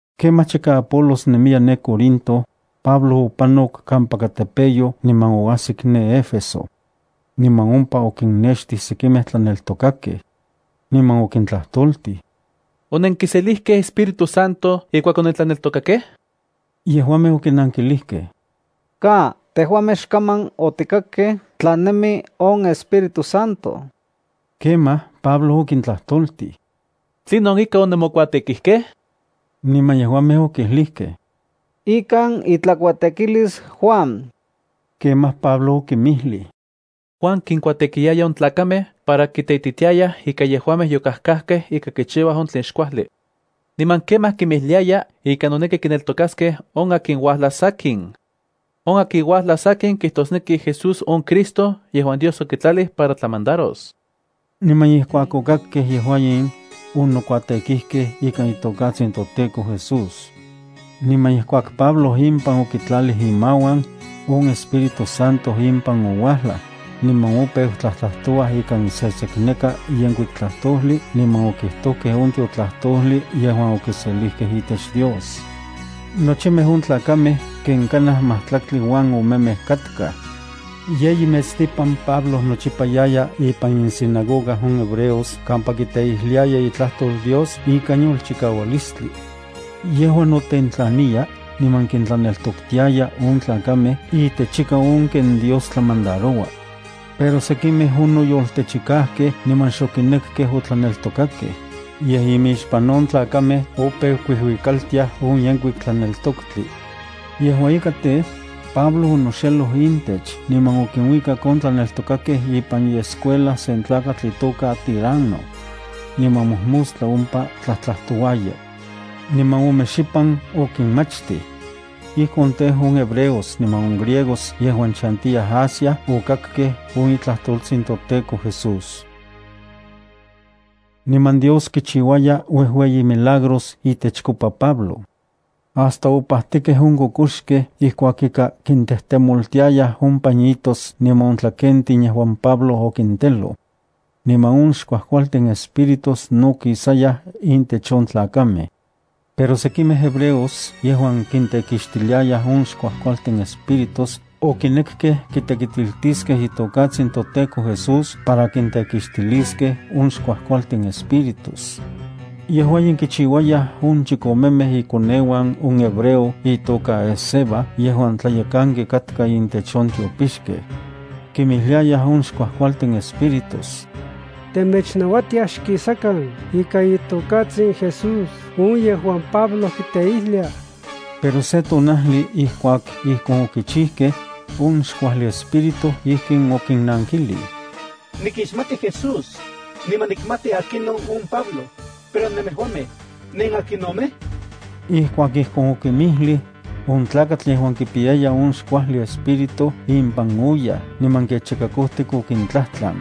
Kemaj chika Apolos nemiya ne Corinto, Pablo opanok kampaka tepeyoj niman oajsik ne Éfeso. Niman ompa okinnextij sekimej tlaneltokakej. Niman okintlajtoltij: —¿Onenkiselijkej Espíritu Santo ijkuak onentlaneltokakej? Yejuamej okinankilijkej: —Ka, tejuamej xkaman otikakkej tla nemi on Espíritu Santo. Kemaj, Pablo okintlajtoltij: —¿Tlinon ika onemokuatekijkej? Niman yejuamej okijlijkej: —Ikan itlakuatekilis Juan. Kemaj Pablo okinmijlij: —Juan kinkuatekiyaya on tlakamej para kiteititiayaj ika yejuamej yokajkajkej ika kichiuaj on tlen xkuajli. Niman kemaj kinmijliaya ika noneki kineltokaskej on akin uajlas sakin. On akin uajlas sakin kijtosneki Jesús on Cristo yejuan Dios okitlalij para tlamandaros. Niman ijkuak okakkej yejua in, onokuatekijkej ikan itokatsin toTEKO Jesús. Niman ijkuak Pablo impan okitlalij imauan, on Espíritu Santo impan ouajlaj, niman opeu tlajtlajtouaj ikan sesekneka yenkuik tlajtojli niman okijtojkej on tiotlajtojli yejuan okiselijkej itech Dios. Nochimej on tlakamej ken kanaj majtlaktli uan omemej katkaj. Yeyi metstipan Pablo nochipa yaya ipan insinagoga on hebreos kampa kiteijliaya itlajtol Dios ikan yolchikaualistli. Yejua notentlaniya niman kintlaneltoktiaya on tlakamej itechika on ken Dios tlamandaroua. Pero sekimej onoyoltechikajkej niman xokinekkej otlaneltokakej, yej imixpan on tlakamej opeu kuijuikaltiaj on Yenkuik Tlaneltoktli. Yejua ika tej, Pablo onoxeloj intech niman okinuikak on tlaneltokakej ipan iescuela sen tlakatl itoka Tiranno. Niman mojmostla ompa tlajtlajtouaya. Niman ome xipan okinmachtij. Ijkon tej, on hebreos niman on griegos yejuan chantiyaj Asia okakkej on itlajtoltsin toTEKO Jesús. Niman Dios kichiuaya uejueyi milagros itechkopa Pablo. Hasta opajtikej on kokoxkej ijkuak ika kintejtemoltiayaj on pañitos niman on tlakentin yejuan Pablo okinteloj. Niman on xkuajkualtin espíritus no kisayaj intech on tlakamej. Pero sekimej hebreos yejuan kintekixtiliayaj on xkuajkualtin espíritus okinekkej kitekitiltiskej itokatsin toTEKO Jesús para kitekixtiliskej on xkuajkualtin espíritus. Yejua in kichiuayaj on chikomemej ikoneuan on hebreo itoka Esceva yejuan tlayekanki katka intech on tiopixkej. Kimijliayaj on xkuajkualtin espíritus: —Temechnauatiaj xkisakan ikan itokatsin Jesús on yejuan Pablo kiteijlia. Pero se tonajli ijkuak ijkon okichijkej, on xkuajli espíritu ijkin okinnankilij: —Nikixmati Jesús, niman nikmati akinon on Pablo, pero nemejuamej, ¿nenakinomej? Ijkuak ijkon okinmijlij, on tlakatl yejuan kipiyaya on xkuajli espíritu impan oyaj niman kechika kojtik okintlajtlan.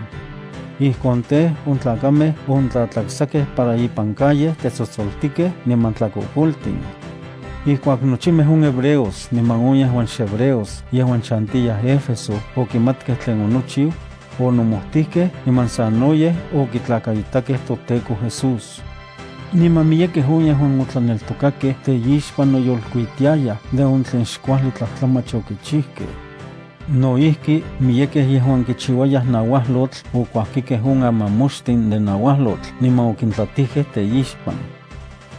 Ijkon tej, on tlakamej ontlatlaksakej para ipan calle tetsotsoltikej niman tlakokoltin. Ijkuak nochimej on hebreos niman on yejuan xhebreos yejuan chantiyaj Éfeso okimatkej tlen onochiu, onomojtijkej niman sanoyej okitlakaitakej toTEKO Jesús. Niman miyekej on yejuan otlaneltokakej teixpan noyolkuitiayaj de on tlen xkuajli tlajtlamach okichijkej. No ijki, miyekej yejuan kichiuayaj nauajlotl okuajkikej on amamoxtin de nauajlotl niman okintlatijkej teixpan.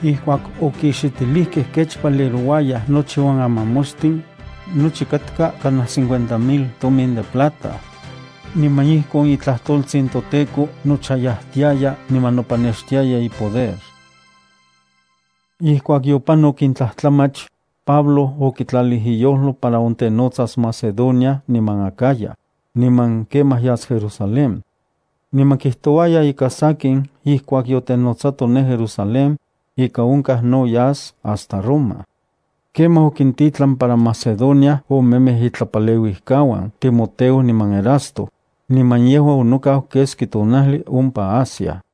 Ijkuak okixitilijkej kech valerouayaj nochi on amamoxtin, nochi katka kanaj cincuenta mil tomin de plata. Niman ijkon itlajtoltsin toTEKO nochayajtiaya niman nopanextiaya ipoder. Ijkuak yopanok in tlajtlamach, Pablo okitlalij iyojlo para ontenotsas Macedonia niman Acaya, niman kemaj yas Jerusalén. Niman kijtouaya ika sakin ijkuak yotenotsato ne Jerusalén, ika onkaj no yas hasta Roma. Kemaj okintitlan para Macedonia omemej itlapaleuijkauan Timoteo niman Erasto, niman yejua onokau keski tonajli ompa Asia.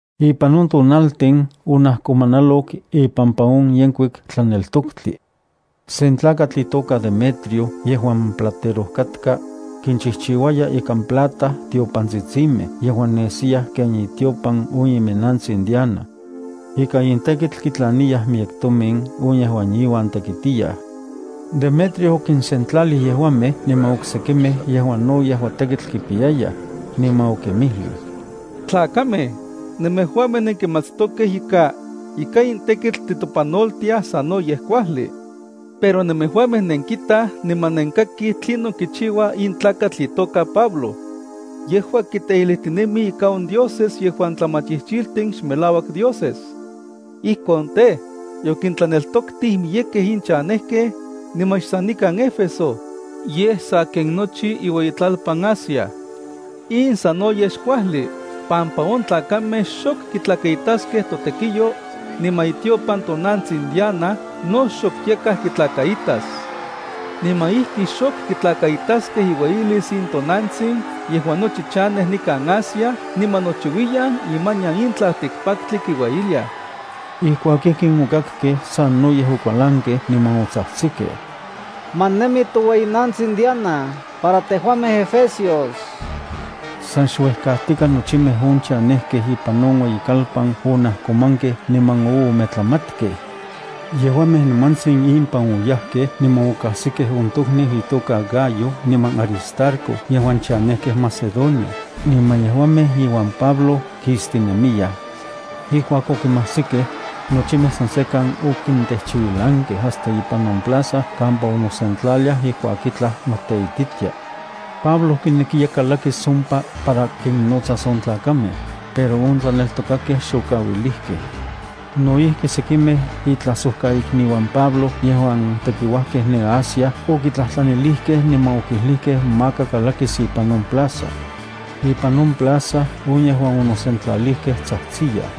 Ipan on tonaltin onajkomanalok ipampa on Yenkuik Tlaneltoktli. Sen tlakatl itoka Demetrio yejuan platero katka, kinchijchiuaya ikan plata tiopantsitsimej yejuan nesiyaj ken itiopan on iminnantsin Diana. Ika in tekitl kitlaniyaj miyek tomin on yejuan inuan tekitiyaj. Demetrio okinsentlalij yejuamej niman oksekimej yejuan no yejua tekitl kipiyayaj, niman okinmijlij: —Tlakamej, nemejuamej nenkimatstokej ika, ika in tekitl titopanoltiaj sanoyej kuajli. Pero nemejuamej nenkitaj niman nenkakij tlinon kichiua in tlakatl itoka Pablo. Yejua kiteijlijtinemi ika on dioses yejuan tlamachijchijtin xmelauak dioses. Ijkon tej, yokintlaneltoktij miyekej in chanejkej, niman xsan nikan Éfeso, yej sa ken nochi iueyitlalpan Asia. In sanoyej xkuajli, pampa on tlakamej xok kitlakaitaskej totekiyo, niman itiopan tonantsin Diana no xok yakaj kitlakaitas. Niman ijki xok kitlakaitaskej iueyilis in tonantsin yejuan nochi chanej nikan Asia niman nochiuiyan imanian in tlaltikpaktli kiueyiliaj. Ijkuak ijkin okakkej, sanoyej okualankej niman otsajtsikej: —¡Ma nemi toueyinantsin Diana para tejuamej efesios! San xuejkajtika nochimej on chanejkej ipan on ueyikalpan onajkomankej niman oometlamatkej. Yejuamej nimantsin impan oyajkej niman okajsikej on tokniu itoka Gayo niman Aristarco yejuan chanejkej Macedonia niman yejuamej iuan Pablo kistinemiyaj. Ijkuak okinmajsikej, nochimej san sekan okintejchiuilankej hasta ipan on plaza kampa onosentlaliaj ijkuak itlaj noteititia. Pablo kinekiya kalakis ompa para kinnotsas on tlakamej, pero on tlaneltokakej xokauilijkej. No ijki sekimej itlajsojkaikniuan Pablo yejuan tekiuajkej ne Asia okitlajtlanilijkej niman okijlijkej maka kalakis ipan on plaza. Ipan on plaza on yejuan onosentlalijkej tsajtsiyaj.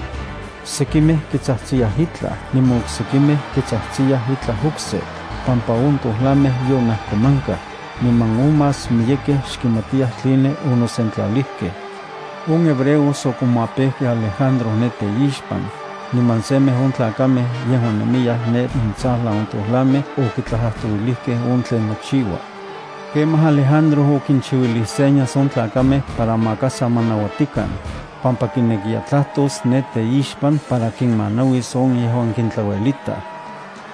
Sekimej kitsajtsiyaj itlaj niman oksekimej kitsajtsiyaj itlaj okse, pampa on tojlamej yonajkomankaj, niman on más miyekej xkimatiyaj tline onosentlalijkej. On hebreos okomapejkej Alejandro ne teixpan, niman semej on tlakamej yejuan nemiyaj ne intsajlan on tojlamej okitlajtlajtouilijkej on tlen nochiua. Kemaj Alejandro okichiuilij señas on tlakamej para maka sa ma nauatikan, pampa kinekiya tlajtos ne teixpan para kinmanauis on yejuan kintlauelitaj.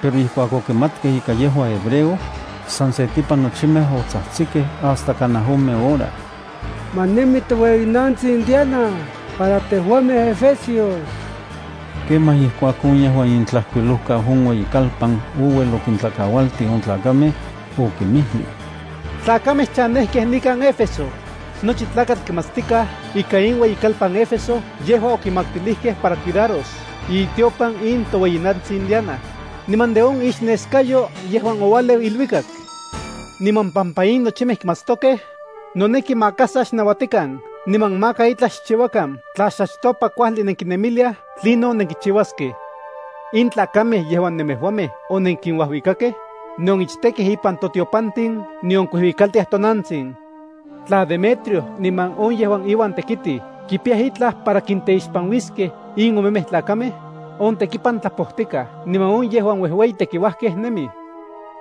Pero ijkuak okimatkej ika yejua hebreo, san setipan nochimej otsajtsikej hasta kanaj ome hora: —¡Ma nemi toueyi tonantsin Diana para tejuamej efesios! Kemaj ijkuak on yejuan itlajkuilojkau on ueyikalpan ouel okintlakaualtij on tlakamej, okinmijlij: —Tlakamej chanejkej nikan Éfeso, nochi tlakatl kimatstikaj ika in ueyikalpan Éfeso yejua okimaktilijkej para cuidaros itiopan in toueyinantsin Diana, niman de on ixneskayo yejuan oualeu iluikak. Niman pampa in nochimej kimatstokej, noneki maka sa xnauatikan niman maka itlaj xchiuakan tla xachtopa kuajli nenkinemiliaj tlinon nenkichiuaskej. In tlakamej yejuan nemejuamej onenkinuajuikakej nion ichtekej ipan tiopantin nion kuijuikaltiaj tonantsin. Tla Demetrio niman on yejuan iuan tekitij kipiyaj itlaj para kinteixpanuiskej in omemej tlakamej, on tekipan tlapojtikaj niman on yejuan uejueyi tekiuajkej nemij.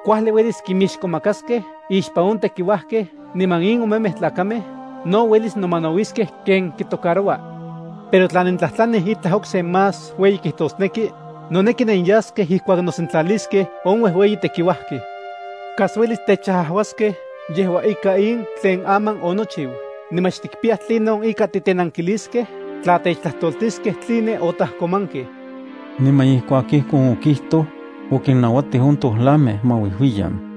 Kuajli uelis kinmixkomakaskej ixpan on tekiuajkej niman in omemej tlakamej no uelis nomanauiskej ken kitocaroua. Pero tla nentlajtlanij itlaj okse más ueyi kijtosneki, noneki nenyaskej ijkuak nosentlaliskej on uejueyi tekiuajkej. Kas uelis techajuaskej yejua ika in tlen aman onochiu niman xtikpiyaj tlinon ika titenankiliskej tla techtlajtoltiskej tline otajkomankej. Niman ijkuak ijkon okijtoj, okinnauatij on tojlamej ma uijuiyan.